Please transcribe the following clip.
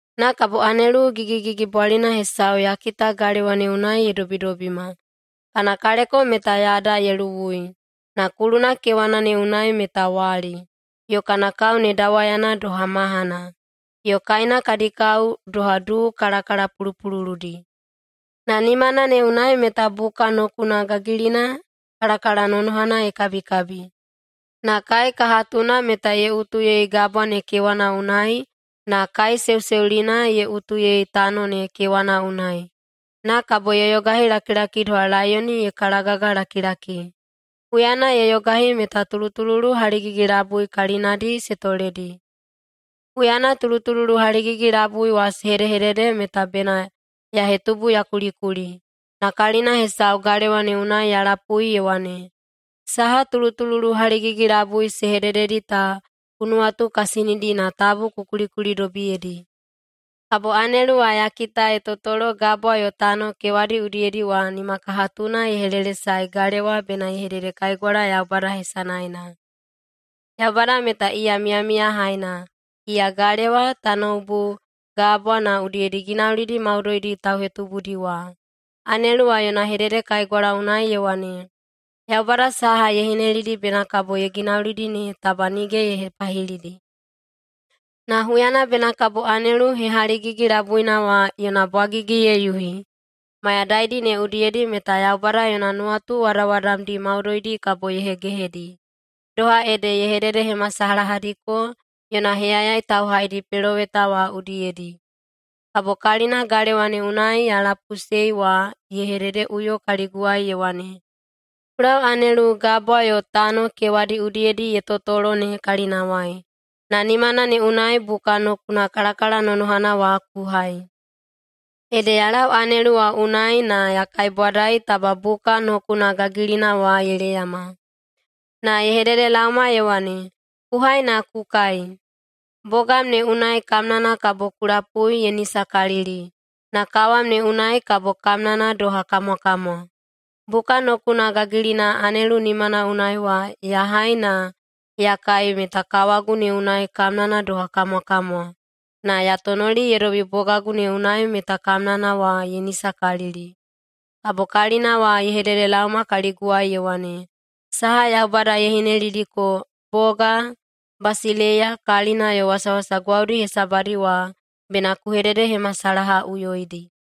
Na kabo anelu gigigigibwalina hesau ya kita galewa ne unai ye dobidobima. Kana kaleko meta yada ye luwui, na kuluna kewana ne unai meta wali, yo kana kao ne dawayana doha mahana, yo kaena kadi kao doha duu kalakalapulupululudi. Na nimana ne unai meta buka nokuna gagilina kalakalanonohana ye kabikabi. Na kaekahatuna meta ye utuyei gabwa ne kewana unai na kaeseuseulina ye utuyei tano ne kewana unai. Na kabo ye yogahilakilaki doha laiyoni ye kalagagalakilaki. Huyana ye yogahi meta tulutululu haligigi-labui kalinadi se toledi. Huyana tulutululu haligigi-labui wa se hedehedede meta bena ya hetubu ya kulikuli, na kalina hesau galewa ne unai ya lapui ye wane, “Saha tulutululu haligigi-labui se hedededi ta ku nuwatukasinidi na tabu ku kulikulidobiyedi.” Kabo anelu wa ya kita ye totolo gabwa yo tano kewadi udiyedi wa nimakahatuna ye helelesae galewa bena ye hededekaigwala Yaubada hesanaena. Yaubada meta iya miyamiyahaina, iya galewa, tanoubu, gabwa, na udiyedi ginaulidi maudoidi tauhetubudi wa. Anelu wa yona hededekaigwala unai ye wane, “Yaubada saha ye hinelidi bena kabo ye ginaulidi ne taba nige ye hepahilidi. Na huyana bena kabo anelu hehaligigi-labuina wa yona bwagigi ye yuhi, mayadaidi ne udiyedi meta Yaubada yona nuwatu wadawadamdi maudoidi kabo ye hegehedi, doha ede ye hededehemasalahadiko yona heyayai tauhaidi peloweta wa udiyedi.” Kabo kalina galewa ne unai ya lapuiꞌusei wa ye hededeꞌuyo kaliguwai ye wane, “Ku lau anelu gabwa yo tano kewadi udiyedi ye totolo ne kalinawai, na nimana ne unai buka nokuna kalakalanonohana wa ku hai.” Ede ya lau anelu wa unai na ya kaibwadai taba buka nokuna gagilina wa ye leyama. Na ye hededelaoma ye wane, “Ku hai na ku kai. Bogam ne unai kamnana kabo ku lapui ye nisakalili, na kawam ne unai kabo kamnana doha kamwakamwa.” Buka nokuna gagilina anelu nimana unai wa ya hai na ya kai meta kawagu ne unai kamnana doha kamwakamwa, na ya tonoli ye dobi bogagu ne unai meta kamnana wa ye nisakalili. Kabo kalina wa ye hededelaoma kaliguwai ye wane, “Saha Yaubada ye hinelidiko boga, basileiya, kalina yo wasawasa gwaudi hesabadi wa bena ku hededehemasalahaꞌuyoidi.”